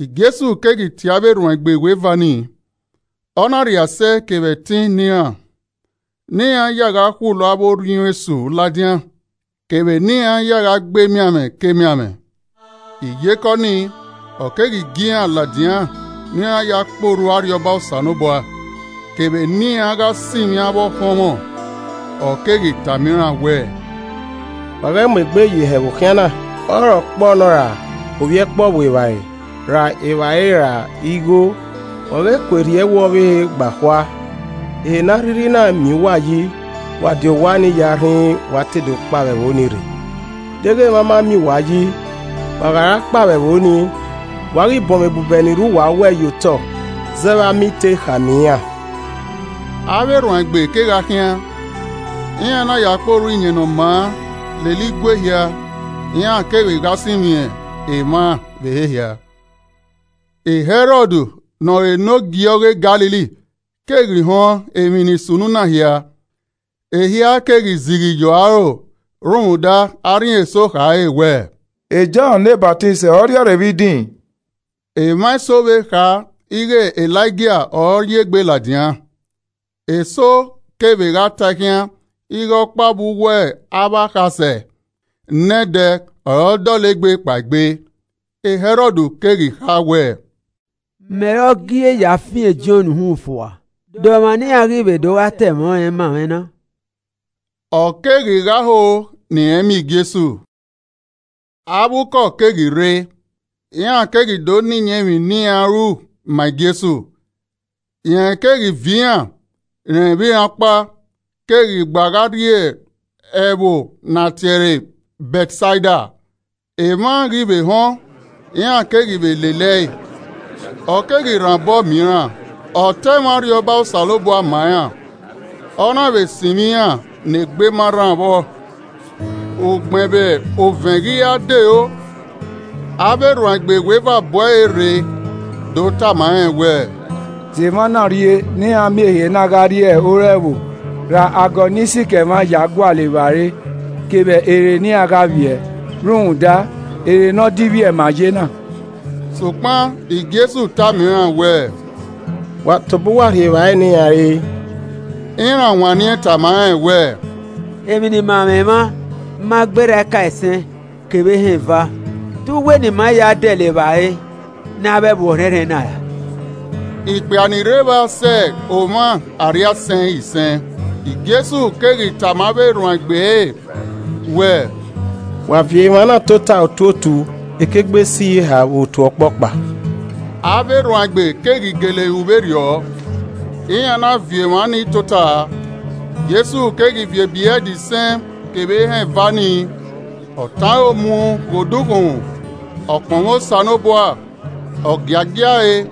Jesu keghi tie avbe erhuanegbe iweva nii, ọ na rhie asẹ kevbe ẹtin ne iran ne iran ya gha khulo avbe orhiọn esu ladian kevbe ne iran ya gha gbe emianmwẹ kemianmwẹ. Iyeke ọnii, ọ keghi gie iran ladian ne iran ya kpe orhu Arriọba Osanobua kevbe ne iran gha sinmwi avbe ọkhọnmwẹ. Ọ keghi tama iran wẹẹ, “Wa ghẹ mu egbe ye ihẹ vbe okhian na, ọre ọkpọ nọ ra ovbi ẹkpo ọvbuevbare, ra evbare ra igho, wa ghẹ kue rhie ẹwu ọvbehe gba khua. Ehe ne a rhirhi na miẹn uwa yi, wa di owa nii ya rhinrin wa te do kpao vbe ẹvbo ni rre. Deghẹ emwa ma miẹn uwa yi, wa gha ra kpao vbe ẹvbo nii, wa ghi bọnmwẹ ebubẹ ni rre uwa owẹ ye otọ zẹ vbe ama I te kha ne iran.” Avbe erhuanegbe kegha khian, iran na ya kpe orhu Iyẹn Ne Ọ Maa lele igue hia, iran kevbe gha sinmwi emwa vbe ehe hia. Hẹrọd ne ọre enogie ọghe Galili keghi họn emwi ni sunu na hia, ehia keghi zighi ye ọre aro rhunmwuda arhin eso khare wẹẹ, “E Jọn ne Ọsamẹ ọre ọ rhiọrre vbe idin!” Emwa eso vbe kha ighe Elaija ọre ọ ye egbe ladian, eso kevbe gha tae khian ighe ọkpa vbe uwu avbe akhasẹ nẹdẹ ọre ọ dọlegbe kpaegbe. Hẹrọd keghi kha wẹ, “Mẹ ọre ọ gie ya fian e Jọn uhunmwu fua, de ọmwa ne iran ghi vbe do gha ta ẹmwẹ ọnrẹn ma mwẹ na?” Ọ keghi gha ho ne irẹn miẹn Jesu. Avbe ukọ keghi rre, iran keghi do na iyẹn emwi ne iran ru ma Jesu. Rẹn keghi viọ iran, rẹn vbe iran ọkpa, keghi gba gha rrie ẹvbo ne a tie ẹre Bẹtsaida. Emwa ghi vbe họn, iran keghi vbe lele ẹe, ọ keghi rhan obọ miẹn iran, ọ ta ẹmwẹ Arriọba Osanobua ma iran, ọ na vbe sinmwi iran ne egbe ma rran vbọ. Ugbẹn vbe ovẹn ghi ra dero, avbe erhuanegbe iweva bu ẹre rre do tama rẹn wẹẹ, “Zẹ emwa na urrie ne iran miẹn ehe na gha rrie ore ẹvbo ra agọ ni sikẹ emwa ya gualọ evbare kevbe ehe ne iran gha vbiẹ, rhunmwuda ehe ne ọ divbiẹ ma ye na.” Sokpan Jesu tama iran wẹẹ, “Wa tobọ uwa rhie evbare ne iran re.” Iran wanniẹn tama rẹn wẹẹ, “Emwi ne ima mwẹ mwa ma gberra ebrẹd isẹn kevbe ehẹn eva. Te u wẹ ne ima ya dẹlẹ evbare ne avbe ẹvbo ọrhẹnrhẹn na?” (Ikpia ni rre evba sẹ omwa arriaisẹn isẹn.) Jesu keghi tama avbe erhuanegbe ẹre wẹẹ, “Wa viọ emwa na tota ye otu ekigbesiyeha vbe otu ọkpọkpa.” Avbe erhuanegbe keghi gele ru vberriọ, iran na viọ emwa nii tota. Jesu keghi viọ ebrẹd isẹn kevbe ehẹn eva ni, ọ tọn aro mu ghe odukhunmwu, ọ kpọnmwẹ Osanobua, ọ giagia ẹe,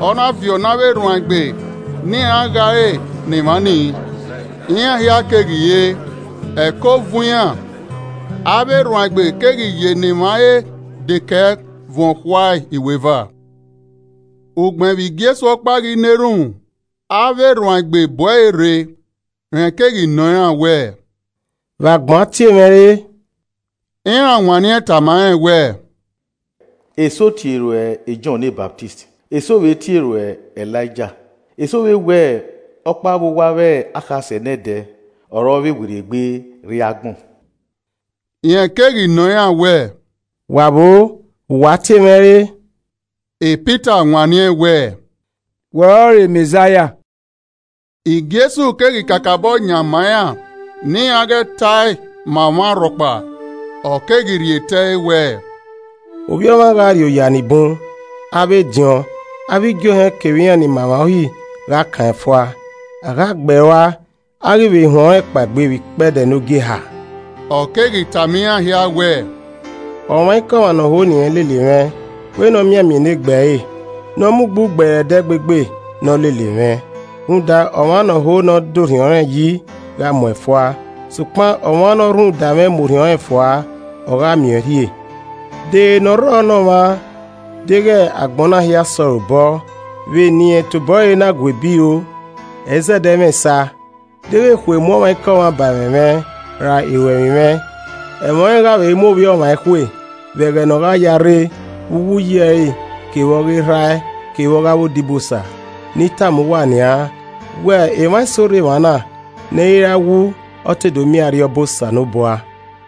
ọ na viọ ne avbe erhuanegbe ne iran gha ẹre ne emwa nii. Iran hia keghi re, ẹko vuọn iran. Avbe erhuanegbe keghi ye ne emwa re dekẹe vuọn okhuae iweva. Ugbẹn vbe Jesu ọkpa ghi na erhunmwu, avbe erhuanegbe bu ẹre rre. Rẹn keghi nọ iran wẹẹ, “Vbe agbọn tie mwẹ re?” Iran wanniẹn tama rẹn wẹẹ, “Eso tie ruẹ e Jọn ne Ọsamẹ, eso vbe tie ruẹ Elaija, eso vbe wẹ ọkpa vbe uwu avbe akhasẹ nẹdẹ ọre ọ vbe werriegbe rrie agbọn.” Rẹn keghi nọ iran wẹẹ, “Wa vbo, vbe uwa tie mwẹ re?” Pita wanniẹn wẹẹ, “Wẹ ọrọre Mẹzaia!” Jesu keghi kakabọ yan ma iran ne iran ghẹ ta ẹe ma ọmwa rhọkpa. Ọ keghi rhie tẹe wẹẹ, “Ovbi Ọmwa gha rri oya nibun, avbe ediọn, avbe igie ohẹn kevbe iran ni ma emwa Uhi gha kan ẹn fua. A gha gbe ẹe rua, a ghi vbe huẹn ọnrẹn kpaegbe vbe ikpẹdẹ ne ogieha.” Ọ keghi tama iran hia wẹẹ, “Ọmwaikọmwa ne ọ ho ne irẹn lele mwẹ, wẹ ne ọ mianmian enegbe ẹre, ne ọ mu ugbugbe ẹre ẹdẹgbegbe, ne ọ lele mwẹ. Rhunmwuda ọmwa ne ọ ho ne ọ da orhiọn rẹn yi gha mu ẹn fua, sokpan ọmwa ne ọ rhunmwuda mwẹ mu orhiọn rẹn rua, ọ gha miẹn ọẹn rhie. De ere ne ọ rrọ ne ọmwa, deghẹ agbọn na hia sẹ ọre obọ vbe ne irẹn tobọ ẹre na gu ebi ro. Ẹ i zẹdẹ mwẹ esa. Deghẹ ekhue mu ọmwaikọmwa ba ẹmwẹ mwẹ ra iruemwi mwẹ, ẹmwẹ ọnrẹn gha vbe mu Ovbi Ọmwa ekhue vbe ẹghẹ ne ọ gha ya rre vbe uwu uyi ẹre kevbe ọghe Erha ẹe kevbe ọghe avbe odibosa. Ne I tama uwa nian wẹẹ emwa eso rre emwa, ne ẹ ra wu ọ te do miẹn Arriọba Osanobua.”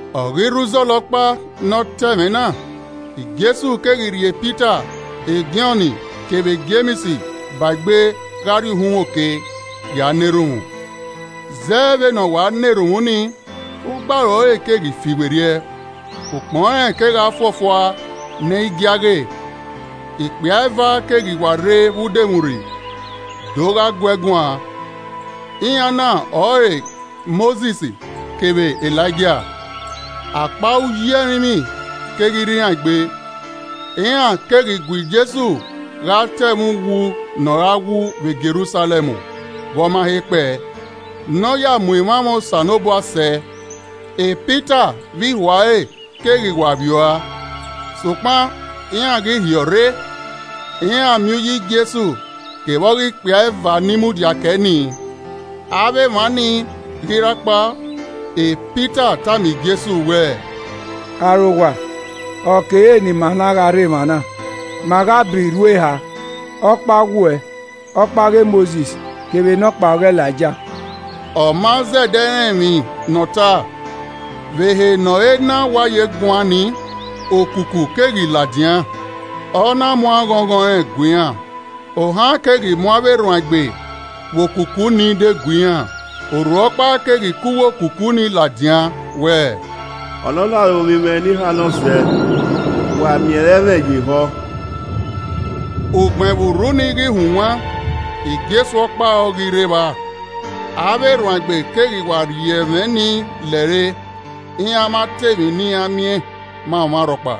Ọ ghi rre uzọla ọkpa ne ọ ta ẹmwẹ na, Jesu keghi rhie Pita Jọn kevbe Jems ba egbe gha rrie uhunmwu oke, ya na erhunmwu. Zẹ vbene ọ wa na erhunmwu ni, ugbaro ẹre keghi fiwerriẹ, ukpọn rẹn kegha fuọfua nẹ i gie a ghe. Ikpia eva keghi wa rre vbe udomwurri do gha guee guan, iran na ọre Mosis kevbe Elaija. Akpa uyi ẹrinmwi keghi rre iran egbe, iran keghi gu Jesu gha ta ẹmwẹ uwu ne ọ ra wu vbe Jerusalẹm vbe ọ ma he kpẹe, ne ọ ya mu emwamwa Osanobua sẹ. Pita vbe ihuare keghi wa vbiẹ ua sokpan iran ghi ọrre, iran miẹn uyi Jesu kevbe ọghe ikpia eva ni mudia kẹe ni. Avbe emwa nii ghi ra kpao, e Pita tama Jesu wẹẹ, “Arowa, ọ kere ne ima na gha rre emwa. Ma gha bọ irhu eha, ọkpa ọghe uwẹ, ọkpa ọghe Mosis kevbe nọkpa ọghe Elaija!” (Ọ ma zẹdẹ rẹn emwi ne ọta.) Vbe ehe ne ọ he na wa ye guan nii, okuku keghi ladian, ọ na mu aghọnghọn rẹn gue iran, ohan keghi mu avbe erhuanegbe vbe okuku ni degue iran. Urhu ọkpa keghi ke uwu okuku nii ladian wẹẹ, “Ọnọna ọre Ovbi mwẹ ne I hannọ zẹ, wa miẹn ere ẹmwẹ ye ehọ.” Ugbẹn vbe urhu ni ghi hunwan, Jesu ọkpa ọre ọ ghi rre evba. Avbe erhuanegbe keghi wa rhie ẹmwẹ ni lẹre, iran ma ta emwi ne iran miẹn ma ọmwa rhọkpa.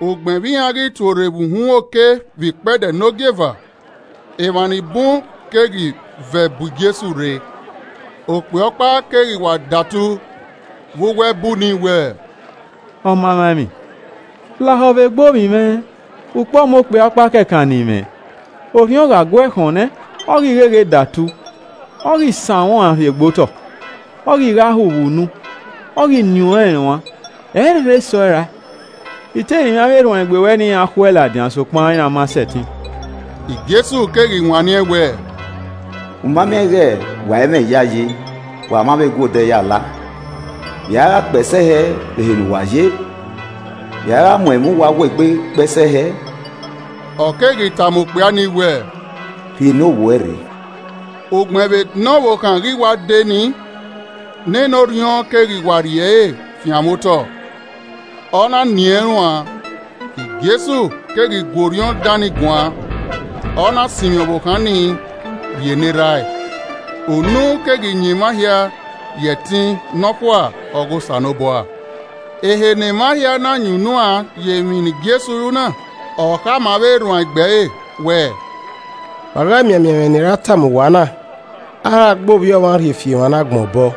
Ugbẹn vbe iran ghi tuorre vbe uhunmwu oke vbe ikpẹdẹ ne ogieva, emwa ni bun keghi vẹ bu Jesu rre. Okpia ọkpa keghi wa datu vbe uwu ẹbu nii wẹẹ, “Ọmamwaemwi, lahọ vbe egbe ovbi mwẹ, ukpọmọ okpia ọkpa kẹkan ne I mwẹ! Orhiọn gha guẹ khọn nẹ, ọ ghi gheghe datu, ọ ghi sanmwẹ ọẹn rhie gbe otọ, ọ ghi gha hu vbe unu, ọ ghi nien rẹn uan, ẹ i rherhe sẹ ọe rae. I te rinmwian avbe erhuanegbe ruẹ ne iran khu ẹe ladian sokpan iran ma sẹtin.” Jesu keghi wanniẹn wẹẹ, “U ma miẹn ighe wa i mwẹ iyayi wa ma vbe guẹ odẹ ya la! Vbe i a ghi kpẹe sẹ hẹ vbe ehe ne uwa ye? Vbe i a gha mu ẹmwẹ uwa wuo egbe kpẹe sẹ hẹ?” Ọ keghi tama okpia ni wẹ, “Rhie ne ovbi uẹ rre.” Ugbẹn vbe ne ọvbokhan ghi wa dee nii, nene orhiọn keghi wa vbe rhie ẹre fianmwẹ otọ, ọ na nien rẹn uan, Jesu keghi gu orhiọn dan nii guan, ọ na sinmwi ọvbokhan ni rhie ne erha ẹe. Unu keghi yan emwa hia ye ẹtin nọkhua ọghe Osanobua. Ehe ne emwa hia na yan unuan ye emwi ne Jesu ru na, ọ khama avbe erhuanegbe ẹre wẹẹ, “Wa ghẹ mianmian ẹmwẹ ne I ra tama uwa na. A ra gba Ovbi Ọmwa rhie fi emwa ne agbọn obọ!”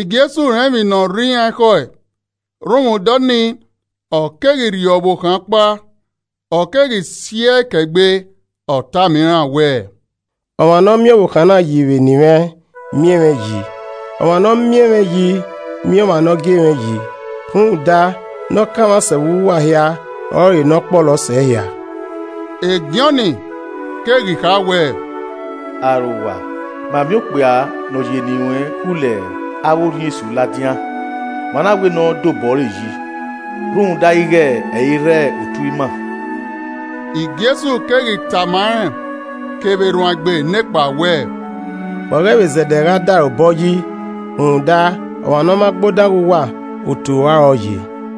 Jesu rẹn emwi ne ọ rre iran ekhọe, rhunmwuda ọnii, ọ keghi rhie ọvbokhan ọkpa, ọ keghi si ẹe kẹ egbe. Ọ tama iran wẹẹ, “Ọmwa ne ọ miẹn ọvbokhan na yi vbe eni mwẹ, miẹn mwẹ yi. Ọmwa ne ọ miẹn mwẹ yi, miẹn ọmwa ne ọ gie mwẹ yi. Rhunmwuda ne ọ kanmwa sẹ vbe uwu uwa hia, ọrọre ne ọ kpọlọ sẹ ehia.” E Jọn keghi kha wẹ, “Arowa, ma miẹn okpia ne ọ ye eni ruẹn khulo avbe orhiọn esu ladian, ma na wẹ ne ọ dobọ ẹre yi rhunmwuda ighe ẹ i rre otu ima.” Jesu keghi tama rẹn kevbe erhuanegbe nekpa wẹẹ, “Wa ghẹ vbe zẹdẹ gha da ẹre obọ yi rhunmwuda, ọmwa ne ọ ma gbe odan ghe uwa, otu rua ọre ọ ye.”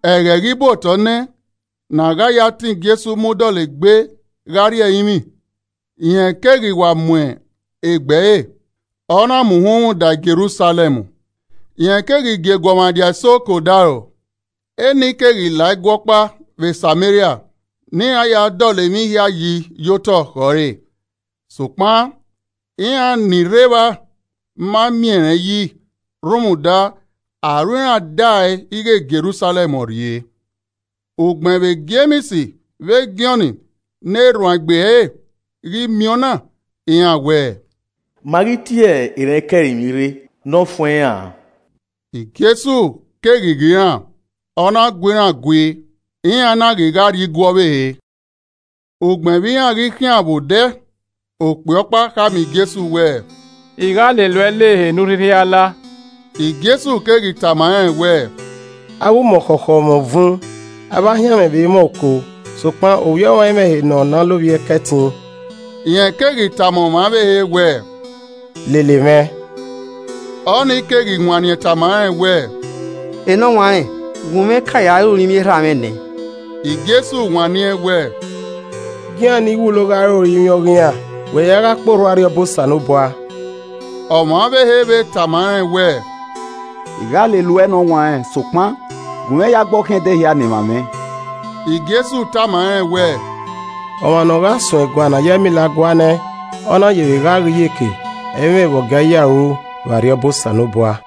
Ẹghẹ ghi bu otọ nẹ ne a gha ya tọn Jesu mu dọlegbe gha rrie ẹrinmwi, rẹn keghi wa mu egbe ẹre, ọ na mu uhunmwu da Jerusalẹm. Rẹn keghi gie eguọmwadia eso ke odaro, eni keghi la igue ọkpa vbe Sameria ne iran ya dọlọ emwi hia yi ye otọ khẹ ọre. Sokpan iran ni rre evba ma miẹn rẹn yi rhunmwuda aro iran dae ighe Jerusalẹm ọre ọ rrie. Ugbẹn vbe Jems vbe Jọn ne erhuanegbe ẹre ghi miẹn ọna, iran wẹẹ, “Ma ghi tie erhẹn ke ẹrinmwi rre ne ọ fuẹn iran an?” Jesu keghi ghe iran, ọ na gu iran gui. Iran na ghi gha rrie igue ọvbehe. Ugbẹn vbe iran ghi khian vbe odẹ, okpia ọkpa khama Jesu wẹẹ, “I gha lele uẹ la ehe ne u rhirhi a la.” Jesu keghi tama rẹn wẹẹ, “Avbe umuọkhọkhọ mwẹ uvun, avbe ahianmwẹ vbe mwẹ oko, sokpan Ovbi Ọmwa i mwẹ ehe ne ọ na lovbiẹ kẹtin.” Rẹn keghi tama ọmwa ọvbehe wẹẹ, “Lele mwẹ,” Ọ ni keghi wanniẹn tama rẹn wẹẹ, “Enọwanrẹn, gunmwẹ ka ya re orinmwi erha mwẹ nẹ.” Jesu wanniẹn wẹẹ, “Gie iran ni wulo gha re orinmwi ọghe iran, wẹ ya gha kpe orhu Arriọba Osanobua.” Ọmwa ọvbehe vbe tama rẹn wẹẹ, “I gha lele uẹ Enọwanrẹn, sokpan, gunmwẹ ya gbe ọ khian ẹdẹ hia ne emwa mwẹ.” Jesu tama rẹn wẹẹ, “Ọmwa ne ọ gha suẹn egua ne a ya ẹmila gua nẹ, ọ na ye vbe gha ghe iyeke, ẹ i mwẹ vbe ọ gie a ya ru vbe Arriọba Osanobua.”